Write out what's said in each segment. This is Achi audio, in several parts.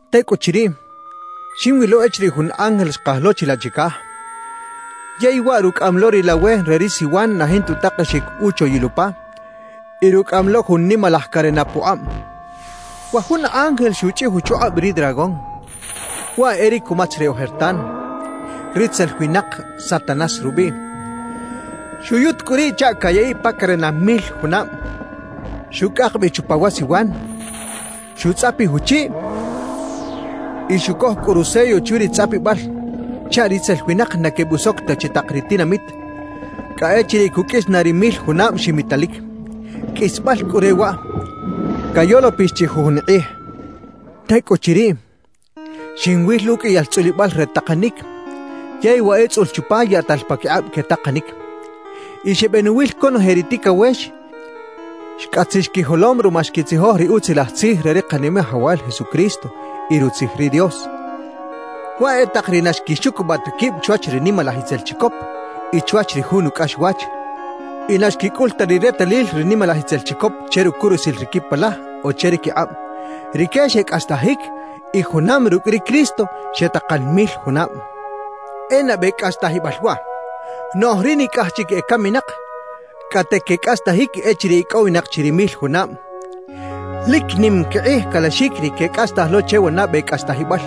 Tecꞌuchiriꞌ, xinwilo echiriꞌ jun ángel xkaj lo chilaꞌ chicaj, yey waꞌ rucꞌaꞌam lo ri lawe re ri siwan na jinta utakexic uchoyil upa y rucꞌaꞌam lo jun nimalaj carena pukꞌab. Wa jun ángel xuchꞌij uchukꞌab ri dragón, waꞌ e ri cumatz re ojertan, ritzel winak Satanás rubiꞌ. Xuyut cꞌu riꞌ chaꞌ cayaꞌiꞌ pa carena mil junab, xucꞌak bi chupa wa siwan, xutzꞌapij uchiꞌ y xucoj cꞌu rusello chwi ri tzꞌapibal chaꞌ ritzel winak na quebusoc ta chi tak ri tinamit cꞌa echiriꞌ cuqꞌuis na ri mil junab ximitalic. Qꞌuisbal cꞌu re waꞌ, cayolopix chi jujun kꞌij. Tecꞌuchiriꞌ, xinwil uqꞌuiyal tzꞌulibal re takanic yey wa etzꞌul chupa yaꞌtal paquikꞌab quetakanic. Y xebenuwil conoje ri ticawex xcꞌatzix quijolom ruma xquitzijoj ri Utzilaj Tzij re ri Kanimajawal Jesucristo y Rutzij ri Dios; waꞌ e tak ri na xquixucubaꞌ ta quib chwach ri nimalaj itzel chicop y chwach ri jun ucꞌaxwach y na xquicꞌul ta ri retalil ri nimalaj itzel chicop che rucurusil ri quipalaj o che ri quikꞌab. Rique xecꞌastajic y junam rucꞌ ri Cristo xetakan mil junab. E nabe cꞌastajibal waꞌ. Noꞌj ri nicꞌaj chic ecaminak cꞌate quecꞌastajic echiriꞌ icꞌowinak chi ri mil junab. Lic nim quikꞌij calaxic ri quecꞌastaj lo che wa nabe cꞌastajibal,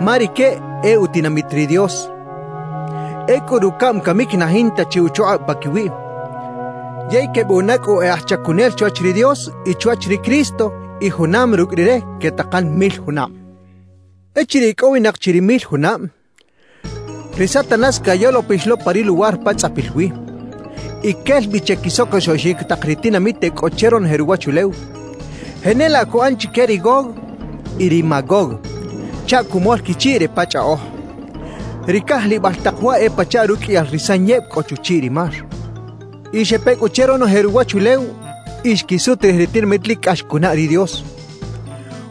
ma rique e utinamit ri Dios. Ecꞌu rucaꞌm camic na jinta chi uchukꞌab paquiwiꞌ, yey quebuꞌana cꞌu e aj chacunel chwach ri Dios y chwach ri Cristo y junam rucꞌ Rire quetakan mil junab. Echiriꞌ icꞌowinak chi ri mil junab, ri Satanás cayolopix lo pa ri luwar pa tzꞌapil wi. Y quel bi che quisocosoꞌxic tak ri tinamit e cꞌo che ronoje ruwachulew, jenelaꞌ cuꞌan chique ri Gog y ri Magog, chaꞌ cumol quichiꞌ re pa chꞌaꞌoj. Ri cajlibal tak waꞌ e pachaꞌ ruqꞌuiyal ri sanyeb cꞌo chuchiꞌ ri mar. Y xepe cꞌu che ronoje ruwachulew y xquisut rij ri tinamit lic cꞌax cunaꞌ ri Dios,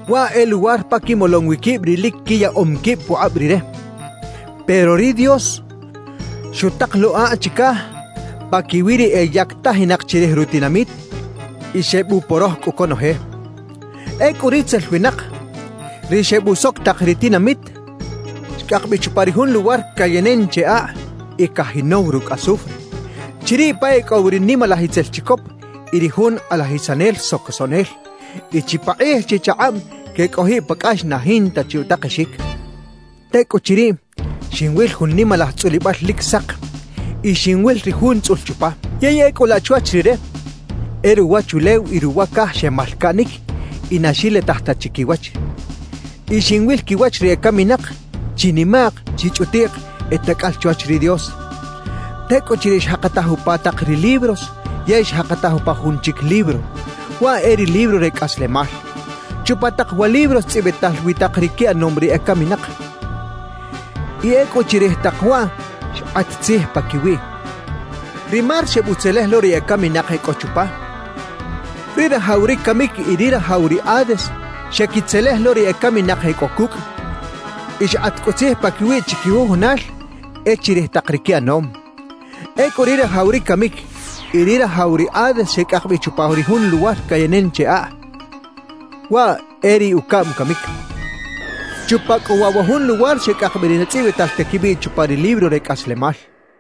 waꞌ e luwar pa quimolom wi quib ri lic quiyaꞌom quib pukꞌab Rire. Pero ri Dios xutak lo akꞌ chicaj paquiwi ri eyactajinak chirij rutinamit, y xebuporoj cꞌu conoje. Ecꞌu ritzel winak, ri xebusoc tak ri tinamit, xcꞌak bi chupa ri jun luwar cayenen che akꞌ y cajinow rucꞌ azufre, chiriꞌ pa e cꞌo wi ri nimalaj itzel chicop y ri jun kꞌalajisanel socosoꞌnel; y chipakꞌij chichakꞌab quecꞌojiꞌ pa cꞌax na jinta chi utakexic. Tecꞌuchiriꞌ, xinwil jun nimalaj tzꞌulibal lic sak y xinwil ri Jun tzꞌul chupa. Yey ecꞌu laꞌ chwach Rire, e ruwachulew y ruwa caj xemalcaꞌnic y na xilitaj ta chi quiwach. Y xinwil quiwach ri ecaminak chinimaꞌk chichꞌutiꞌk e tacꞌal chwach ri Dios. Tecꞌuchiriꞌ xjakataj upa tak ri libros yey xjakataj upa jun chic libro, waꞌ e ri libro re cꞌaslemal. Chupa tak wa libros tzꞌibital wi tak ri quiꞌanom ri ecaminak, y ecꞌu chirij tak waꞌ xkꞌat tzij paquiwiꞌ. Ri mar xebutzelej lo ri ecaminak e cꞌo chupa; ri rajaw ri camic y ri rajaw ri Hades xequitzelej lo ri ecaminak e cꞌo cucꞌ; y xkꞌat cꞌu tzij paquiwiꞌ chiquijujunal e chirij tak ri quiꞌanom. Ecꞌu ri rajaw ri camic y ri rajaw ri Hades xecꞌak bi chupa ri jun luwar cayenen che akꞌ. Waꞌ e ri ucaꞌm camic. Chupa cꞌu waꞌ wa jun luwar xecꞌak bi ri na tzꞌibital ta quibiꞌ chupa ri libro re cꞌaslemal.